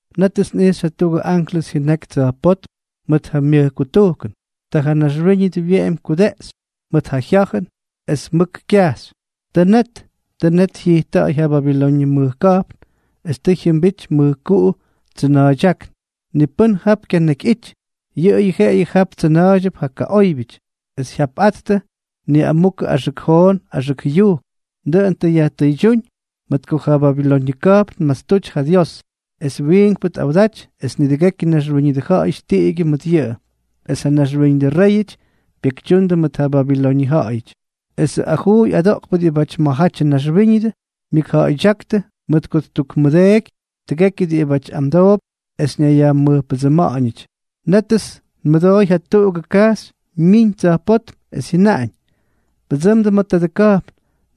Nétʉts nꞌijxy jatuꞌugʉ anklʉs jyʉnaky tsa̱jpótm mʉt ja myʉj kutujkʉn. Ta ja naxwíñʉdʉ wyeꞌemy kudeꞌxy mʉt ja jya̱jʉn, es mʉk kyajxy: —Tʉ net, tʉ net jyijtta̱ꞌa̱y ja Babiloñʉ mʉj ka̱jpn, es tʉ jyʉmbity mʉjkuꞌu tsʉna̱a̱ydyákn. Ni pʉ́n jap kyanakyꞌity. Yʉꞌʉyʉ jeꞌeyʉ jap tsʉna̱a̱ydyʉp ja kaꞌóybyʉty, es jyapꞌattʉ niꞌamukʉ axʉk joon axʉk jʉyujk. Dʉꞌʉn tʉ yajtʉydyúñ mʉt ko ja Babiloñʉ ka̱jpn tmastuty ja Dios, es wiinkpʉ tꞌawdaty, es nidʉgekyʉ naxwíñʉdʉ ja̱ꞌa̱yʉty tiꞌigyʉ mʉt yʉꞌʉ. Es ja naxwíñʉdʉ réyʉty pyekytyuundʉ mʉt ja Babiloñʉ ja̱ꞌa̱yʉty. Esʉ ajuuy adoꞌkpʉ diꞌibʉty ma̱jatyʉ naxwíñʉdʉ, myʉkja̱ꞌa̱ydyáktʉ mʉt ko ttukmʉdeeky nidʉgekyʉ diꞌibáty amdoop es ñayyajmʉjpʉdsʉma̱ꞌa̱ñʉty. Nétʉts nmʉdooy jatuꞌugʉ kajxy myiñ tsa̱jpótm, es jyʉnaꞌañ: —Pʉdsʉmdʉ ma̱ tadʉ ka̱jpn,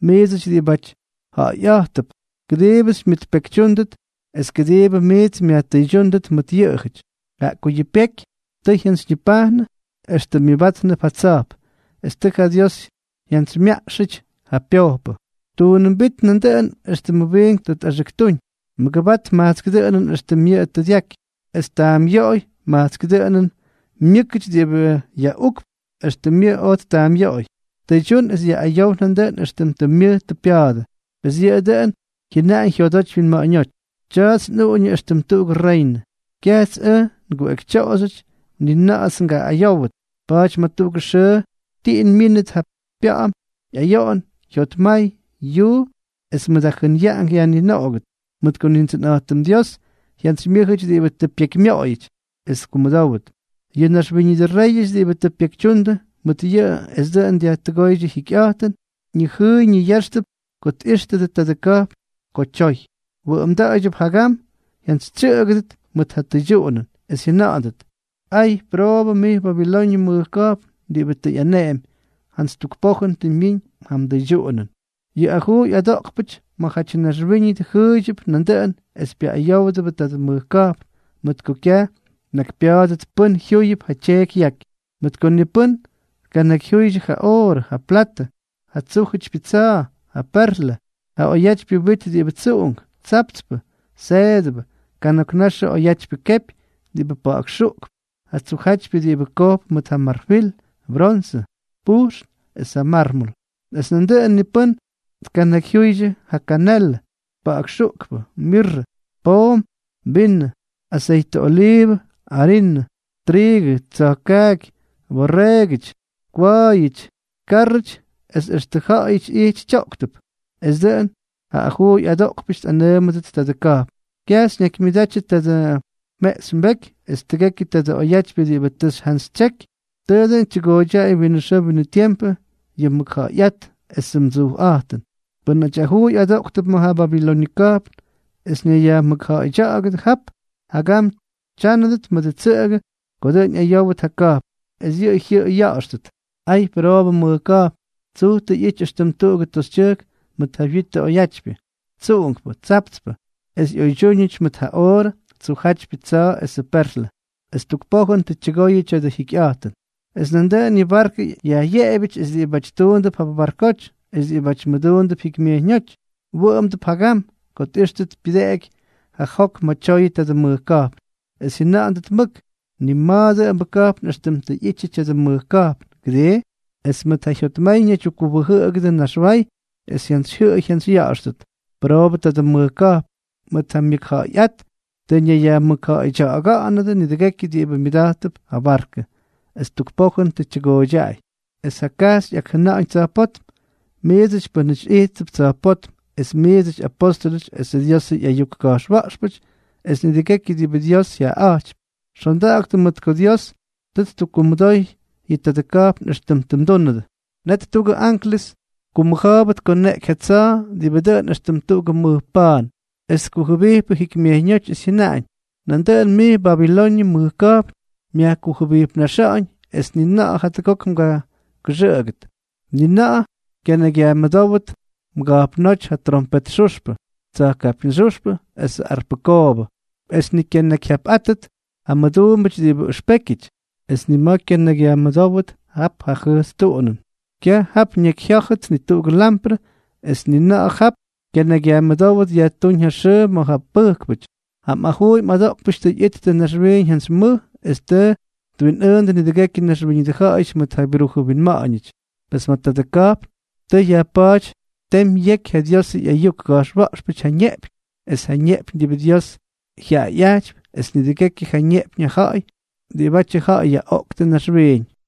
miidsʉty diꞌibáty nja̱ꞌa̱yꞌa̱jttʉp, kʉdiibʉ xymyʉtpekytyúndʉt es kʉdiibʉ miits myajtʉydyúndʉt mʉt yʉꞌʉjʉty. Jaꞌa ko yʉ pyeky tʉ jyantsyñipajnʉ, extʉ myʉbátnʉp ja tsa̱jp, es tʉ ja Dios jyamyajtsxʉty ja pyojpʉ. Tuunʉmbít nandʉꞌʉn éxtʉmʉ wiinkpʉ tʉ tꞌaxʉktúñ. Mʉgʉbat majtsk dʉꞌʉnʉn éxtʉm yʉꞌʉ tʉ dyaky, es taamꞌyoꞌoy majtsk dʉꞌʉnʉn myʉ́kʉty diꞌibʉ yaꞌukp éxtʉm yʉꞌʉ oj ttaamꞌyoꞌoy. Tʉydyún es yaꞌꞌayow nandʉꞌʉn éxtʉm tʉ myʉj tʉ pya̱a̱dʉ. Pes yʉꞌʉ dʉꞌʉn jyʉnaꞌañ jyodoty wyinma̱ꞌa̱ñóty: “Tya̱a̱ts nꞌuꞌuñʉ éxtʉm tuꞌugʉ reynʉ. Kyajts ʉj nguꞌekytyoꞌoxyʉty, ni na̱ꞌa̱ts ngaꞌꞌayówʉt.” Pa̱a̱ty ma̱ tuꞌugʉ xʉʉ tiꞌin myínʉt ja pya̱ꞌa̱m, ꞌyayoꞌon, jyotmay, yuu, es mʉt ja jʉnyaꞌank yajninoꞌogʉt, mʉt ko Nindsʉnꞌa̱jtʉm Dios jyantsymyʉ́jʉty diꞌibʉ tʉ pyekymyoꞌoyʉty es tkumʉdówʉt. Yʉ naxwíñʉdʉ réyʉty diꞌibʉ tʉ pyekytyundʉ mʉt yʉꞌʉ es dʉꞌʉn tʉ dyajtʉgóydyʉ jyikyꞌa̱jtʉn, ñijʉꞌʉy ñiya̱ꞌa̱xtʉp ko tꞌíxtʉdʉ tadʉ ka̱jpn ko tyoy. Wʉꞌʉmda̱a̱ydyʉp jagam jyantsytsyʉꞌʉgʉt mʉt ja tyʉydyuꞌunʉn, es jyʉna̱ꞌa̱ndʉt: —¡Ay, pʉroobʉ mij Babiloñʉ mʉj ka̱jpn diꞌibʉ tʉ ꞌyaneꞌemy! Jantsy tuk pojʉn tʉ myiñ ja mdʉydyuꞌunʉn. Yʉ ajuuy adoꞌkpʉty ma̱jatyʉ naxwíñʉdʉ jʉꞌʉydyʉp nandʉꞌʉn es pyaꞌꞌayówdʉbʉ tadʉ mʉj ka̱jpn, mʉt ko kyaj tnakypya̱a̱dʉt pʉ́n jyúyʉp ja tyeeky yaky, mʉt ko ni pʉ́n tkanakyjyuydyʉ ja oorʉ, ja platʉ, ja tsujjátypyʉ tsa̱a̱, ja perlʉ, ja oyatypyʉ wit diꞌibʉ tsuꞌunk, tsaptspʉ, seedʉbʉ, kana̱k naxʉ oyatypyʉ kepy diꞌibʉ pa̱ꞌa̱k xuꞌkp, ja tsujjátypyʉ diꞌibʉ kojp mʉt ja marfil, bronsʉ, pujxn es ja mármol; es nandʉꞌʉn ni pʉ́n tkanakyjyuydyʉ ja kanelʉ, pa̱ꞌa̱k xuꞌkpʉ, mirrʉ, poom, vinʉ, aseytʉ oliivʉ, arinʉ, triigʉ, tsa̱jka̱a̱jʉty, borreegʉty, kwa̱a̱yʉty, kárrʉty, es extʉ ja̱ꞌa̱yʉty ijty tyoꞌktʉp. Es dʉꞌʉn yʉ ajuuy adoꞌkpʉty tꞌanʉʉmʉdʉt tadʉ ka̱jpn: —Kyaj xyñakymyʉdatyʉ tadʉ mjeꞌxy mbeky es tʉgekyʉ tadʉ oyatypyʉ diꞌibʉ tʉ xyjantsytsyeky. Tʉʉ dʉn tyʉgooydyaꞌay winʉ xʉʉ winʉ tiempʉ yʉ mmʉkja̱ꞌa̱yꞌát esʉ mdsujꞌa̱jtʉn. Pʉ́nʉty ajuuy adoꞌktʉp ma̱ ja Babiloñʉ ka̱jpn es ñayyajmʉkja̱ꞌa̱ydya̱ꞌa̱gʉdʉ jap, jagam tyánʉdʉt mʉdʉ tsʉꞌʉgʉ ko dʉꞌʉn ꞌyayówʉt ja ka̱jpn, es yʉꞌʉ jyʉꞌʉy ya̱ꞌa̱xtʉt: —¡Ay, pʉroobʉ mʉj ka̱jpn! Tsuj tʉ ꞌyity éxtʉm tuꞌugʉ toxytyʉjk mʉt ja wyitʉ oyatypyʉ, tsuꞌunkpʉ, tsaptspʉ, es ꞌyoydyúñʉty mʉt ja oorʉ, tsujjátypyʉ tsa̱a̱ esʉ perlʉ; ¡es tuk pojʉn tʉ tyʉgoyʉ tya̱dʉ jyikyꞌa̱jtʉn! Es nandʉꞌʉn yʉ barkʉ yajꞌyeꞌebyʉty esʉ diꞌibáty tuundʉp jap barkoty, es diꞌibáty mʉduundʉp jikymyejyñóty, wʉꞌʉmdʉp jagam ko tꞌíxtʉt pyʉdeꞌeky ja jok ma̱ tyoyʉ tadʉ mʉj ka̱jpn, es jyʉna̱ꞌa̱ndʉt mʉk: —Ni ma̱a̱ dʉꞌʉmbʉ ka̱jpn éxtʉm tʉ ꞌyityʉ tya̱dʉ mʉj ka̱jpn, ¿kʉdii? Es mʉt ja jyotmay ñaydyukkuwʉjʉꞌkʉdʉ naxway, es jyantsyjyʉꞌʉy jyantsyya̱ꞌa̱xtʉ: —¡Pʉroobʉ tadʉ mʉj ka̱jpn! Mʉt ja myʉkja̱ꞌa̱yꞌát tʉ ñayyajmʉkja̱ꞌa̱ydya̱ꞌa̱gʉdʉ nidʉgekyʉ diꞌibʉ myʉda̱jttʉp ja barkʉ. ¡Es tuk pojʉn tʉ tyʉgooydyaꞌay! Es ja kajxy ꞌyakjʉna̱ꞌa̱ñ tsa̱jpótm: —Miidsʉty pʉ́nʉty ijttʉp tsa̱jpótm, es miidsʉty apóstʉlʉty esʉ Diosʉ ꞌyayuk ka̱jxwa̱ꞌxpʉty es nidʉgekyʉ diꞌibʉ Dios jyaꞌaꞌa̱jtypy, xonda̱ꞌa̱ktʉ mʉt ko Dios tʉ ttukkumʉdoy yʉ tadʉ ka̱jpn éxtʉm tʉ mdúnʉdʉ. Net tuꞌugʉ anklʉs kumʉja̱a̱bʉ tkoneꞌky ja tsa̱a̱ diꞌibʉ dʉꞌʉn éxtʉm tuꞌugʉ mʉj pa̱a̱n, es tkujʉbijpʉ jikymyejyñóty, es jyʉnáñ: —Nandʉꞌʉn mij Babiloñʉ mʉj ka̱jpn, myajkujʉbipnaxa̱ꞌa̱ñ, es ni na̱ꞌa̱ jatʉgok mgakʉxʉꞌʉgʉt. Ni na̱ꞌa̱ kyanakyyajmʉdówʉt mga̱jpnóty ja trompet xuxpʉ, tsa̱jkapyñxyúxpʉ esʉ arpʉ koobʉ. Es ni kyanakyjyapꞌátʉt ja mmʉduumbʉty diꞌibʉ ʉxpékyʉty, es ni ma̱ kyanakyyajmʉdówʉt jap ja jʉjts tuꞌunʉn. Kyaj jap ñakyjyá̱jʉt ni tuꞌugʉ lamprʉ, es ni na̱ꞌa̱ jap kyanakyyajmʉdówʉt yajtúñ ja xʉʉ ma̱ ja pʉjkpʉty. Ja mꞌajuuy mꞌadoꞌkpʉty tʉ ꞌyittʉ naxwiiñ jantsy mʉj, es tʉ twinꞌʉʉndʉ nidʉgekyʉ naxwíñʉdʉ ja̱ꞌa̱yʉty mʉt ja byrujʉ winma̱ꞌa̱ñʉty. Pes ma̱ tadʉ ka̱jpn tʉ yajpa̱a̱ty temy yeky ja Diosʉ ꞌyayuk ka̱jxwa̱ꞌxpʉty ja ñeꞌpyñ, es ja ñeꞌpyñ diꞌibʉ Dios jyaꞌayꞌajtypy, es nidʉgekyʉ ja ñeꞌpyñ ja ja̱ꞌa̱y diꞌibʉty ja̱ꞌa̱y yaꞌoꞌkʉdʉ naxwiiñ.